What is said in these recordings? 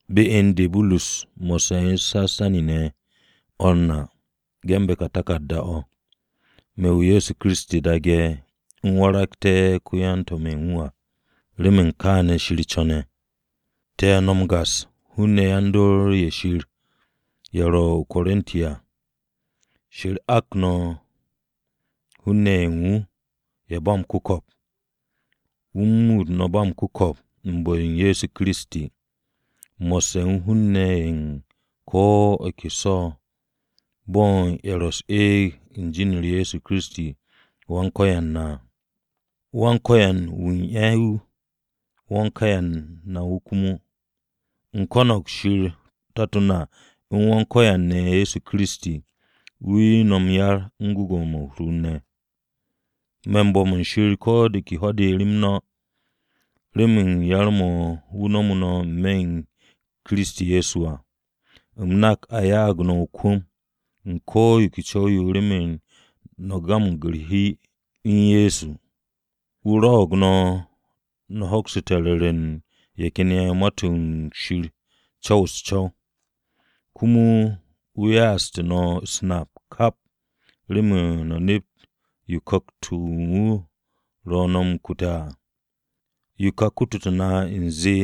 Me̱ Burus mo̱sse̱ u̱n Sastanis ne̱ o̱r na, ge̱nbe̱ ka taku̱rda-o̱. Me̱ wu̱ Ye̱so Kiristi daage̱, u̱m waragté̱ ko-yan-To̱m-o̱ u̱n wu̱ à, remen kaane̱ Shir co̱ne̱. Te̱ no̱ m-gas hun-ne̱ yan-dor-o̱ u̱n Shir ye̱ ro̱ o-Korinti à. Shir ak no̱ hun-ne̱ ye̱ u̱n wu̱ ye̱ ba m-ku̱ko̱p. Wu̱ u̱n muut no̱ ba m-ku̱ko̱p u̱n bu̱-o Ye̱so Kiristi, mo̱sse̱ u̱n hun-ne̱ ye̱ u̱n ko̱ ke so̱ ne̱ bo̱ u̱n ye̱ ro̱ u̱s-eeg u̱n jin-u̱r Ye̱so Kiristi Wan-Ko̱yan à. Wan-Ko̱yan wu̱ u̱n ye̱ wu̱, Wan-Ko̱yan na wu̱ komo. U̱m ko̱no̱g Shir Tato na u̱n Wan-Ko̱yan ne̱ Ye̱so Kiristi, wu̱ 'ye no̱ m-yar u̱n gwu̱gwu̱-mo̱ u̱r-hur ne̱. Me̱ m-bo̱m u̱n Shir ko̱ de ke ho̱-de rem no̱, remen yar-mo̱ wu̱ nomo no̱ n-me̱ u̱n Kiristi Ye̱so à. No̱ nak a ya'ag no̱ o-kwu̱m u̱n ko̱ yo ke co̱w-yo remen no̱ gamag u̱r-hi u̱n Ye̱so ne̱. Wu̱ rwo̱'o̱g no̱, no̱ hokste̱ ru̱re̱ u̱n ye̱ ken ye̱ Ma-to̱ Shir co̱w u̱s-co̱w. Komo wu̱ ya'aste̱ no̱ u̱s-nap kap remen no̱ nept yo Ku̱kt-o̱ u̱n wu̱ ro̱ no̱ m-kute̱ à. Yo ka kututu̱ na u̱nze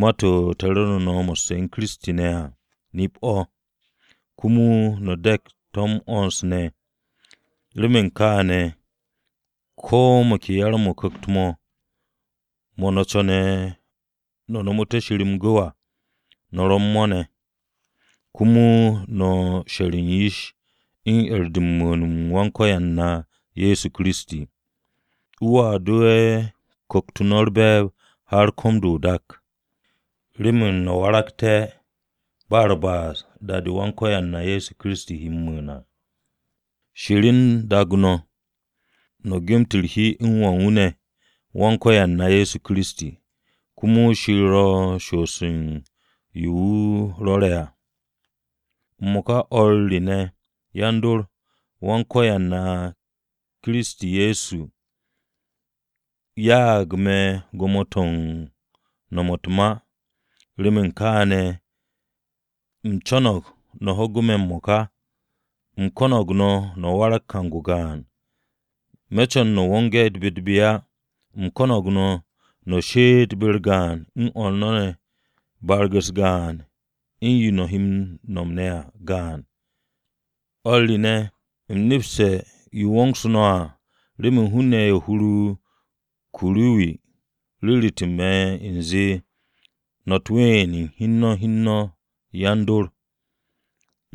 ma-to̱ te̱ ru̱ru̱ no̱ mo̱sse̱ u̱n Kiristi ne̱ à, nip-o̱. Komo no̱ de̱k to̱ m-'wo̱ns ne̱. Remen kaane̱, ko̱ mo̱ ke yar-mo̱ o-Ku̱kt mo̱, mo̱ no̱ co̱ne̱ no̱ nomote̱ Shir m-gu̱w à, no̱ ro̱ u̱n mo̱ ne̱. Komo no̱ sher yish u̱n 'er-de u̱n mu̱u̱n-m Wan-Ko̱yan na Ye̱so Kiristi. Wu̱a dowe̱ ku̱kt-o no̱ u̱r-be̱e̱b har ko̱m-de o-da, remen no̱ waragté̱ ba u̱r-ba'as da-de Wan-Ko̱yan na Ye̱so Kiristi he m-mu̱u̱n à. Shir u̱n daag no̱. No̱ gemet u̱r-hi u̱n Wà u̱n wu̱ ne̱, Wan-Ko̱yan na Ye̱so Kiristi. Komo Shir ro̱ m-shoos u̱n yo wu̱ rwo̱re̱ à. M-mo̱ka o̱r re ne̱, yan-dor, Wan-Ko̱yan na Ye̱so Kiristi, ya'ag me̱ gwo̱mo-to̱ u̱n nom u̱t-ma. Remen kaane̱, u̱m co̱no̱g no̱ ho̱gu̱ me̱ m-mo̱ka. U̱m ko̱no̱g no̱ no̱ warag kang-o gaan. Me̱ co̱n no̱ wonge̱ be-u̱t-be á. U̱m ko̱no̱g no̱, she'et no̱ be-u̱r gaan u̱n o̱r no̱ ne̱ barag-u̱s gaan u̱n yo no̱ he m-nom ne̱ à gaan. O̱r re ne̱, u̱m nepse̱ yo wongsu̱ no̱ à, remen hun-ne̱ ye̱ u̱n hur-o Kuruwi ru̱ru̱tu̱ me̱ u̱nze no̱ u̱t-ween u̱n hi u̱n no̱ yan-dor.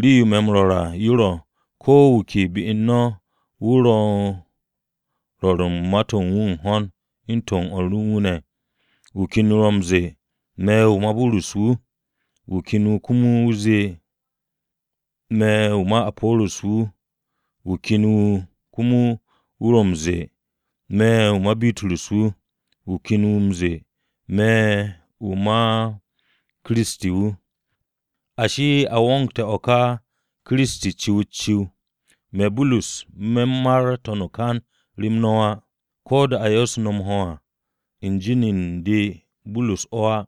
Rii-yo me̱ m-rwo̱r à yo ro̱, ko̱ wu̱ ke be u̱n no̱ wu̱ ro̱ u̱n rwo̱r u̱t-ma u̱n ho̱n u̱n to̱ u̱n o̱r u̱n wu̱ ne̱. Wu̱ ken wu̱ ro̱ m-ze̱e̱, “Me̱ wu̱ ma Burus wu̱.” Wu̱ ken wu̱ ro̱ m-ze̱e̱, “Me̱ wu̱ ma Apo̱ro̱s wu̱.” Wu̱ ken wu̱ komo wu̱ ro̱ m-ze̱e̱, “Me̱ wu̱ ma Bitrus wu̱.” Wu̱ ken wu̱ zee, “Me̱ wu̱ ma Kiristi wu̱.” Ashi, no̱ wongte̱ o̱ ka Kiristi ciw-u̱t-ciw. Me̱ Burus, me̱ mar n-to̱n o-kan rem no̱ á. Ko̱ de a yo'osu̱ no̱ m-ho̱ à u̱n jin u̱n de Burus o̱ á.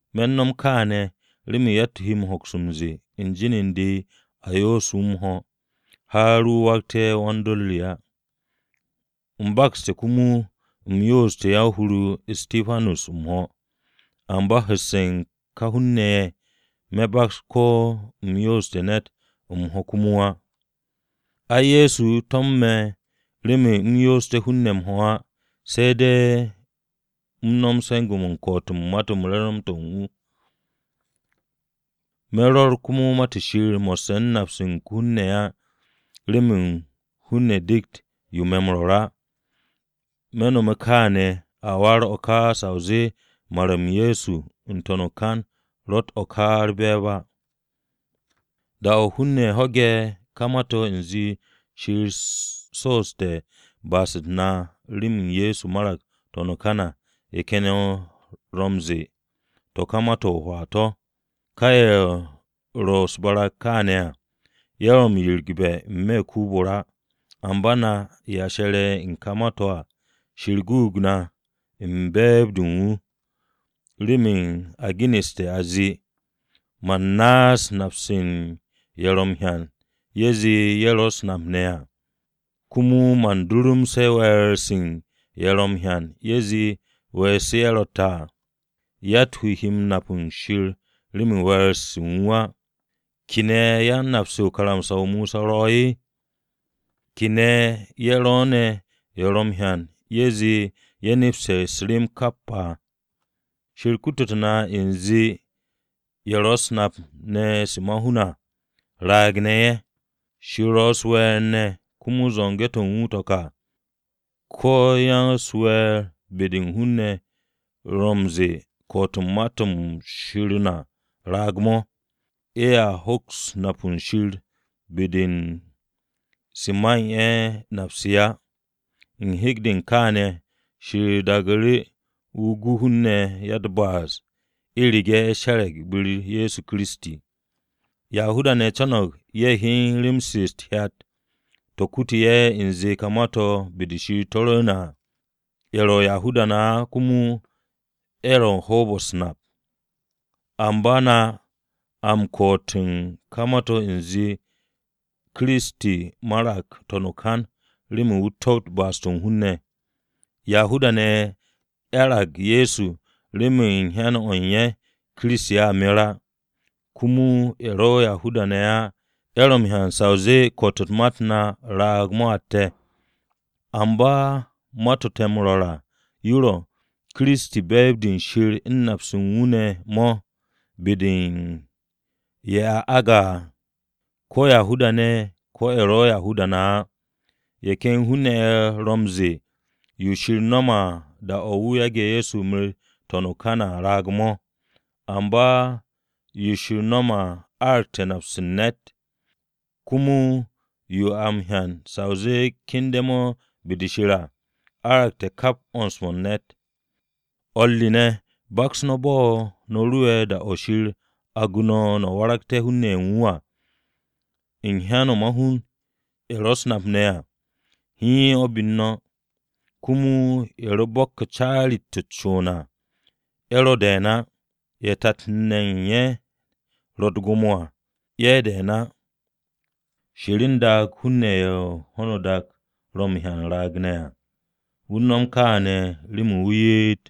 Me̱ u̱n no̱m kaane̱, remen yatt-wu̱ he hoks m-ze̱e̱ u̱n jin u̱n de a yo'osu̱ wu̱ m-ho̱, har wu̱ waragte̱ wan-dor re á. (U̱m bakste̱ komo u̱m yo'oste̱ yan-hur-o Istipanus m-ho̱, amba hu̱sse̱ ka hun-ne̱ ye̱ me̱ baks ko̱ u̱m yo'oste̱ ne̱t m-ho̱ komo á.) Ai, Kiristi to̱mo̱n me̱ remen u̱m yo'osté̱ hun-ne̱ m-ho̱ á, se̱ de̱ u̱m nom se̱nge̱-mo̱ u̱n ko̱'o̱t u̱n Ma-to̱ u̱n wu̱ to̱ m-Re̱re̱m. Me̱ rwo̱r Ma-to̱ Shir mo̱sse̱ u̱n nap-se u̱n ko-hun ne̱ á remen hun-ne̱ dekt yo me̱ m-rwo̱r á. Me̱ nome̱ kaane̱, a warag o̱ ka sa o zee mar-m Ye̱so n-to̱n o-kan ro̱tt o̱ ka u̱r-be̱e̱b á. Da-o̱ hun-ne̱ ho̱ge̱ ka ma-to̱ u̱nze Shir so'oste̱ ba'as-u̱t na remen Ye̱so marag n-to̱n o-kan à, ye̱ ken ye̱ ro̱ m-ze̱e̱ to̱ ka ma-to̱ o-hwaa to̱. Ka ye̱ ro̱ u̱s-barag kaane̱ à, ye̱ ro̱ m-yirigbe̱ n-me̱ u̱n den-o̱ o-ra. Amba na ye̱ she̱re̱ u̱n ka ma-to̱ à Shir guug na u̱n be̱e̱b-de u̱n wu̱. Remen a genu̱ste̱ a zee: “Man naas nap-se u̱n ye̱ ro̱ m-hyan ye̱ zee ye̱ ro̱ u̱s-nap ne̱ à. Komo man durumse̱ we̱e̱r-se u̱n ye̱ ro̱ m-hyan ye̱ zee we̱e̱r-se ye̱ ro̱tte̱ à.” Yatt-wu̱ he nap u̱n Shir remen we̱e̱r-se u̱n wu̱ á. ¿Kene̱ yan-nap-se u̱n karamsa-o Mosa ro̱? ¿Kene̱ ye̱ ro̱ ne̱ ye̱ ro̱ m-hyan ye̱ zee ye̱ nepste̱ u̱s-rem kap à? Shir kututu̱ na u̱nze ye̱ ro̱ u̱s-nap ne̱ se ma-hun à, raag-ne̱ ye̱. Shir ro̱ u̱s-we̱e̱r ne̱ komo zo̱nge̱-to̱ u̱n wu̱ to̱ ka. Ko̱ ya-u̱s-we̱e̱r be-de u̱n hun-ne̱ ye̱ ro̱ m-ze̱e̱ ko̱'o̱t u̱n Ma-to̱ Shir na raag-mo̱, ye̱a hoks nap u̱n Shir be-de u̱n se man ye̱ nap-se á. U̱n hek-o̱ u̱n kaane̱ Shir daagu̱ru̱ wu̱ gu hun-ne̱ ya-u̱t-ba'as u̱rege̱ ye̱ she̱re̱g be-u̱r Ye̱so Kiristi. Yahuda-ne̱ co̱no̱g ye̱ hyen rem-se u̱t-hyat to̱ kutu ye̱ u̱nze ka ma-to̱ be-de Shir to̱ rwu̱u̱ne̱ à. Ye̱ ro̱ Yahuda-ne̱ á komo ye̱ u̱n hoob-o̱ u̱s-nap. Amba na a m-ko̱'o̱t u̱n ka ma-to̱ u̱nze Kiristi marag n-to̱n o-kan remen wu̱ topt ba'as-to̱ u̱n hun-ne̱. Yahuda-ne̱ 'yarag Ye̱so remen u̱n hyan-o̱ u̱n ye̱ Kiristi a mer á. Komo ye̱ ro̱ Yahuda-ne̱ á ye̱ ro̱ m-hyan sa o zee ko̱'o̱t-m ma-u̱t na raag-mo̱ atte̱. Amba ma-to̱ te̱ m-rwo̱r à to̱ ro̱, Kiristi be̱e̱b-de Shir de u̱n nap-se u̱n wu̱ ne̱ be-de u̱n ye̱ a aage̱ à, ko̱ Yahuda-ne̱, ko̱ ye̱ ro̱ Yahuda-ne̱ á. Ye̱ ken hun-ne̱ ye̱ ro̱ m-ze̱e̱ yo Shir nome̱ à da-o̱ wu̱ yage̱ Ye̱so meret n-to̱n o-kan à raag-mo̱. Amba yo Shir nome̱ à aragte̱ nap-se u̱n ne̱t. Komo yo a m-hyan sa o zee kende̱-de be-de Shir à, aragte̱ kap 'wo̱ns-mo̱ u̱n ne̱t. O̱r re ne̱, baks no̱ bo̱ no̱ ro'e̱ da-o̱ Shir agu̱ no̱ à, no̱ waragte̱ hun-ne̱ ye̱ u̱n wu̱ à. U̱n hyan-o̱ ma-hun, ye̱ ro u̱s-nap ne̱ à, hiin o̱ be-u̱r no̱. Komo ye̱ ro bo̱kke̱ caari-to̱ u̱t-con à ye̱ ro de̱e̱n á. Ye̱ tat-ne̱ u̱n ye̱ ro gwo̱mo-ne̱ à ye̱ de̱e̱n á. Shir u̱n daag hun-ne̱ ye̱ ho̱no o-dak ro̱ m-hyan raag-ne̱ à. Wu̱ u̱n nom kaane̱ remen wu̱ ye'et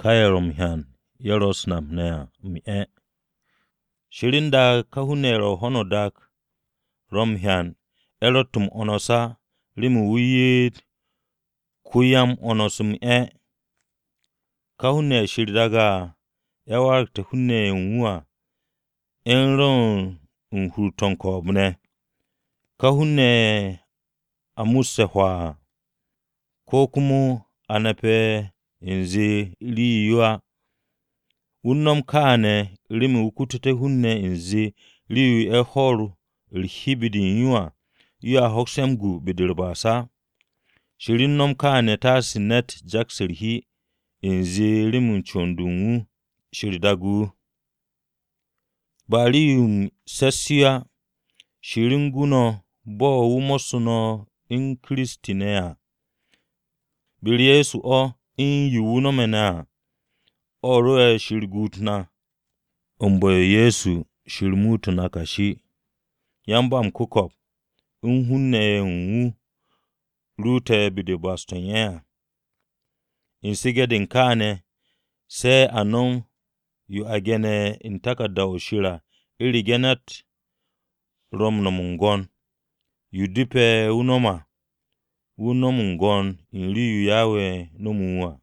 ka ye̱ ro̱ m-hyan ye̱ ro̱ u̱s-nap ne̱ à m-'e̱. Shir u̱n daag ye̱ hun-ne̱ ye̱ u̱n ho̱no o-dak ro̱ m-hyan ye̱ ro̱tt m-'wo̱ns á, remen wu̱ ye'et ko-ya-m-'wo̱ns m-'e̱. Ka hun-ne̱ ye̱ Shir daage̱ à, ye̱ waragté̱ hun-ne̱ ye̱ u̱n wu̱ à ye̱ u̱n rwu̱u̱n u̱n hur-to̱ u̱n ko̱o̱b-ne̱. Ka hun-ne̱ ye̱ a musse̱ hwaa à, ko̱ komo ye̱ a nape̱ u̱nze rii-yo á. Wu̱ u̱n nom kaane̱ remen wu̱ kututé̱ hun-ne̱ u̱nze rii-yo ye̱ hwo̱ u̱r-hi be-de u̱n yo à, yoa hoks ye̱ m-gu be-de u̱r-ba'as á. Shir u̱n nom kaane̱ taase ne̱t jaks u̱r-hi u̱nze remen con-de u̱n wu̱, Shir degt wu̱. Ba rii-yo u̱s-se̱s yo á, Shir o̱ gu no̱ bo̱ wu̱ mo̱ssu̱ no̱ u̱n Ye̱so Kiristi ne̱ à. Be-u̱r Ye̱so o̱, u̱n yo wu̱ nome̱ ne̱ à o̱ rwo̱'e̱ Shir guut na. U̱n bu̱-o Ye̱so Shir muute̱ na kashi, yan-ba-m-ku̱ko̱p, u̱n hun-ne̱ ye̱ wu̱ ruute̱ be-de u̱n ba'as-to̱ u̱n ye̱ à. U̱n su̱ge̱-de u̱n kaane̱, se̱ a nom yo a ge̱ne̱ u̱n taku̱rda-o̱ Shir à. “U̱rege̱ ne̱t ro̱ m-nom m-gwo̱n, yo depe̱ wu̱ no̱m à, wu̱ no̱m m-gwo̱n u̱n rii-yo Yawe nomu̱ wu̱ à.”